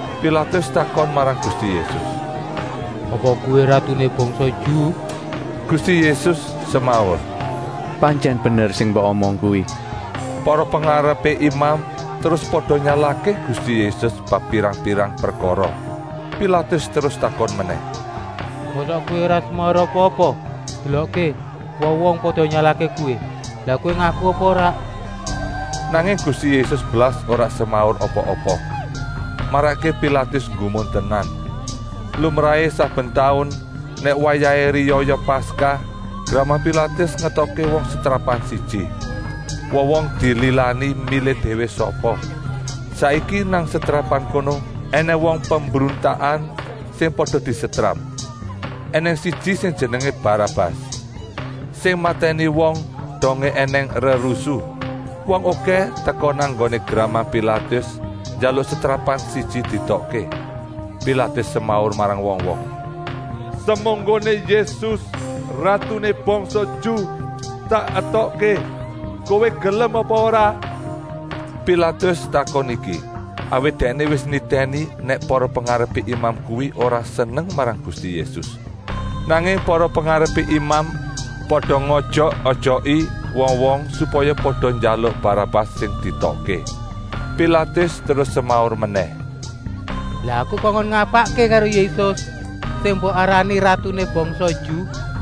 Pilatus takon marang Gusti Yésus: “Apa kowé ratuné bangsa Ju?” Gusti Yésus semaur: “Pantyèn bener sing mbok omong kuwi.” Para pengarepé imam terus pada nyalahké Gusti Yésus bab pirang-pirang prekara. Pilatus terus takon menèh: “Mosok Kowé ora semaur apa-apa? Delokké, wong-wong pada nyalahké Kowé. Lah Kowé ngaku apa ora?” Nanging Gusti Yésus blas ora semaur apa-apa, marakké Pilatus nggumun tenan. Lumrahé saben taun, nèk wayahé riyaya Paskah, gramang Pilatus ngetokké wong setrapan siji. Wong-wong dililani milih déwé sapa. Saiki nang setrapan kono ènèng wong pembruntakan sing pada disetrap. Enèng siji sing jenengé Barabas, sing matèni wong dongé ènèng rerusuh. Wong okèh teka nang nggoné gramang Pilatus njaluk setrapan siji dietokké. Pilatus semaur marang wong-wong: “Semunggoné Yésus, ratuné bangsa Ju, tak etokké, kowé gelem apa ora?” Pilatus takon iki, awit dèkné wis nitèni nèk para pengarepé imam kuwi ora seneng marang Gusti Yésus. Nanging para pengarepé imam pada ngojok-ojoki wong-wong supaya pada njaluk Barabas sing dietokké. Pilatus terus semaur menèh: “Lah aku kongkon ngapakké karo Yésus, sing mbok arani ratuné bangsa Ju!”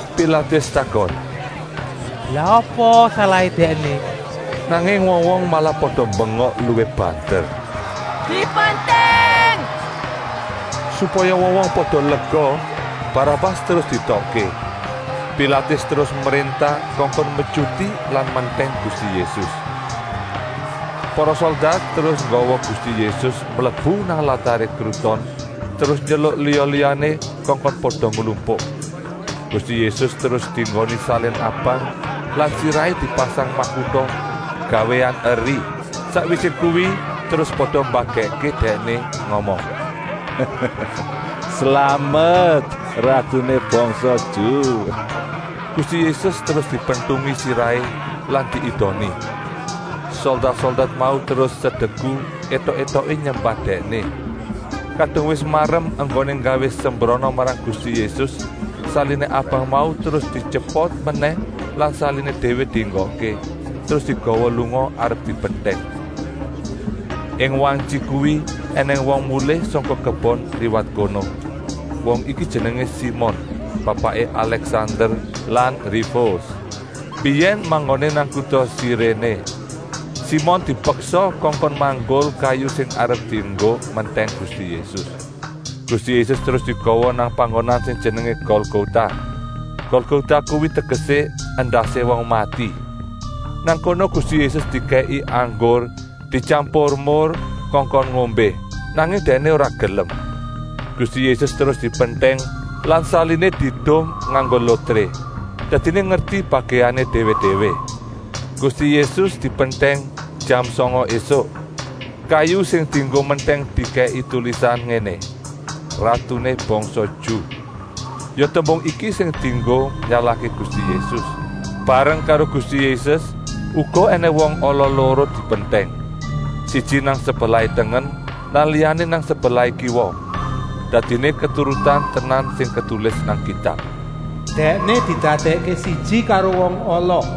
Pilatus takon: “Lah apa salahé Dèkné?” Nanging wong-wong malah pada mbengok luwih banter: “Dipentèng!” Supaya wong-wong pada lega, Barabas terus dietokké. Pilatus terus mréntah kongkon metyuti lan mentèng Gusti Yésus. Para soldat terus nggawa Gusti Yésus mlebu nang lataré kruton terus nyeluk liya-liyané kongkon pada nglumpuk. Gusti Yésus terus dienggoni salin abang lan sirahé dipasang makuta gawéan eri. Sakwisé kuwi terus pada mbagèkké Dèkné ngomong: “Slamet ratuné bangsa Ju!” Gusti Yésus terus dipentungi sirahé lan diidoni. Soldat-soldat mau terus sedeku, étok-étoké nyembah Dèkné. Kadung wis marem enggoné nggawé sembrana marang Gusti Yésus, saliné abang mau terus dityepot menèh lan saliné déwé dienggokké, terus digawa lunga arep dipentèng. Ing wantyi kuwi ènèng wong mulih sangka kebon liwat kono. Wong iki jenengé Simon, bapaké Alèksander lan Rufus, mbiyèn manggoné nang kuta Siréné. Simon dipeksa kongkon manggul kayu sing arep dienggo mentèng Gusti Yésus. Gusti Yésus terus digawa nang panggonan sing jenengé Golgota. Golgota kuwi tegesé: endasé wong mati. Nang kono Gusti Yésus dikèki anggur dityampur mur kongkon ngombé, nanging Dèkné ora gelem. Gusti Yésus terus dipentèng lan saliné diedum nganggo lotré, dadiné ngerti bagèané déwé-déwé. Gusti Yésus dipentèng jam sanga ésuk. Kayu sing dienggo mentèng dikèki tulisan ngéné: “Ratuné bangsa Ju.” Ya tembung iki sing dienggo nyalahké Gusti Yésus. Bareng karo Gusti Yésus uga ènèng wong ala loro dipentèng. Siji nang sebelah tengen lan liyané nang sebelah kiwa. ( Dadiné keturutan tenan sing ketulis nang Kitab: “Dèkné didadèkké siji karo wong ala!”)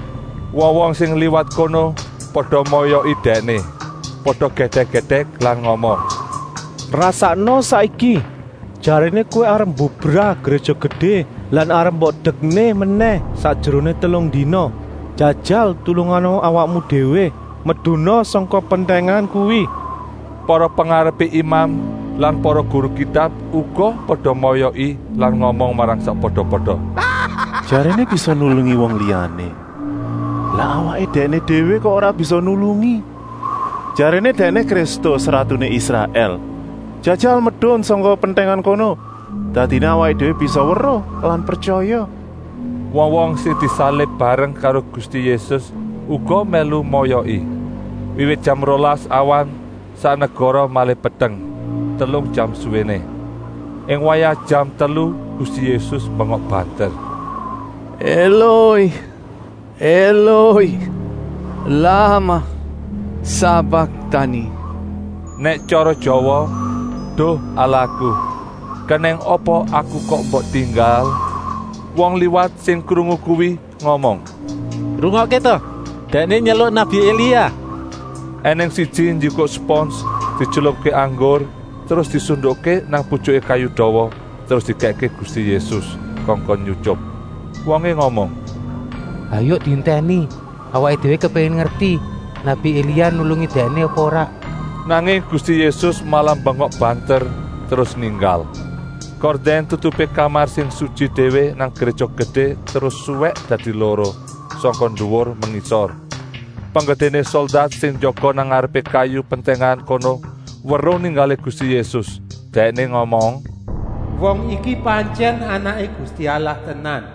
Wong-wong sing liwat kono pada moyoki Dèkné. Pada gèdèk-gèdèk lan muni: “Rasakna saiki! Jaréné Kowé arep mbubrah Gréja Gedé lan arep mbok dekné menèh sakjeroné telung dina. Jajal tulungana awakmu déwé? Meduna sangka pentèngan kuwi.” Para pengarepé imam lan para guru Kitab uga pada moyoki lan ngomong marang sakpada-pada: “Jaréné bisa nulungi wong liyané, lah awaké Dèkné déwé kok ora bisa nulungi? Jaréné Dèkné Kristus, ratuné Israèl. Jajal medun sangka pentèngan kono, dadiné awaké déwé bisa weruh lan pretyaya.” Wong-wong sing disalib bareng karo Gusti Yésus uga mèlu moyoki. Wiwit jam rolas awan sak negara malih peteng, telung jam suwéné. Ing wayah jam telu Gusti Yésus mbengok banter: “Eloi, Eloi, lamah sabaktani?” Nèk tyara Jawa: “Duh Allahku, kenèng apa Aku kok mbok tinggal?” Wong liwat sing krungu kuwi ngomong: “Rungokké ta, Dèkné nyeluk nabi Elia.” Enèng siji njikuk spons dietylupké nang anggur terus disundukké putyuké kayu dawa terus dikèkké Gusti Yésus kongkon nyutyup. Wongé ngomong: “Hayuk dientèni. Awaké déwé kepéngin ngerti nabi Elia nulungi Dèkné apa ora.” Nanging Gusti Yésus malah mbengok banter terus ninggal. Kordèn tutupé kamar sing sutyi déwé nang Gréja Gedé terus suwèk dadi loro, sangka nduwur mengisor. Penggedéné soldat sing jaga nang ngarepé kayu pentèngan kono weruh ninggalé Gusti Yésus. Dèkné ngomong: “Wong iki pantyèn Anaké Gusti Allah tenan.”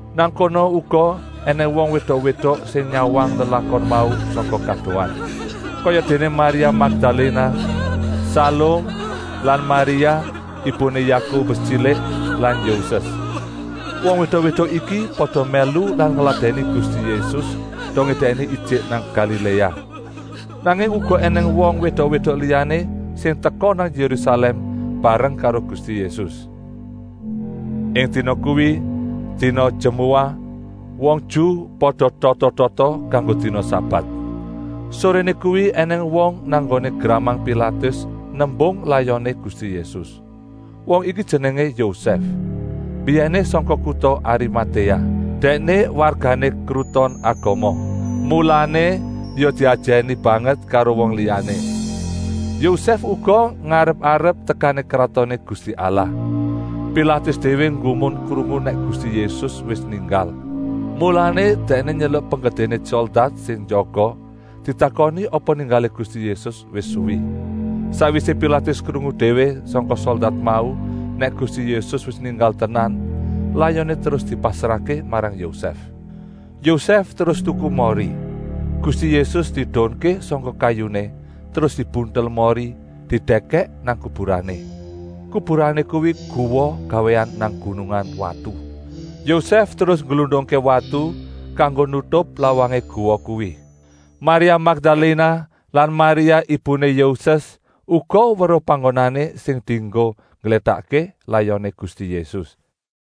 Nang kono uga ènèng wong wédok-wédok sing nyawang lelakon mau sangka kadohan. Kayadéné Maria Makdaléna, Salum lan Maria, ibuné Yakobus Tyilik lan Yoses. Wong wédok-wédok iki pada mèlu lan ngladèni Gusti Yésus dongé Dèkné ijik nang Galiléa. Nanging uga ènèng wong wédok-wédok liyané sing teka nang Yérusalèm bareng karo Gusti Yésus. Ing dina kuwi, dina jemuah, wong Ju pada tata-tata kanggo dina sabat. Soréné kuwi ènèng wong nang nggoné gramang Pilatus nembung layoné Gusti Yésus. Wong iki jenengé Yosèf, mbiyèné sangka kuta Arimatéa. Dèkné wargané Kruton Agama, mulané ya diajèni banget karo wong liyané. Yosèf uga ngarep-arep tekané Kratoné Gusti Allah. Pilatus déwé nggumun krungu nèk Gusti Yésus wis ninggal, mulané dèkné nyeluk penggedéné soldat sing jaga ditakoni apa ninggalé Gusti Yésus wis suwi. Sakwisé Pilatus krungu déwé sangka soldat mau nèk Gusti Yésus wis ninggal tenan, layoné terus dipasrahké marang Yosèf. Yosèf terus tuku mori. Gusti Yésus diedunké sangka kayuné, terus dibuntel mori didèkèk nang kuburané. Kuburané kuwi guwa gawéan nang gunungan watu. Yosèf terus ngglundungké watu kanggo nutup lawangé guwa kuwi. Maria Makdaléna lan Maria ibuné Yoses uga weruh panggonané sing dienggo ngglétakké layoné Gusti Yésus.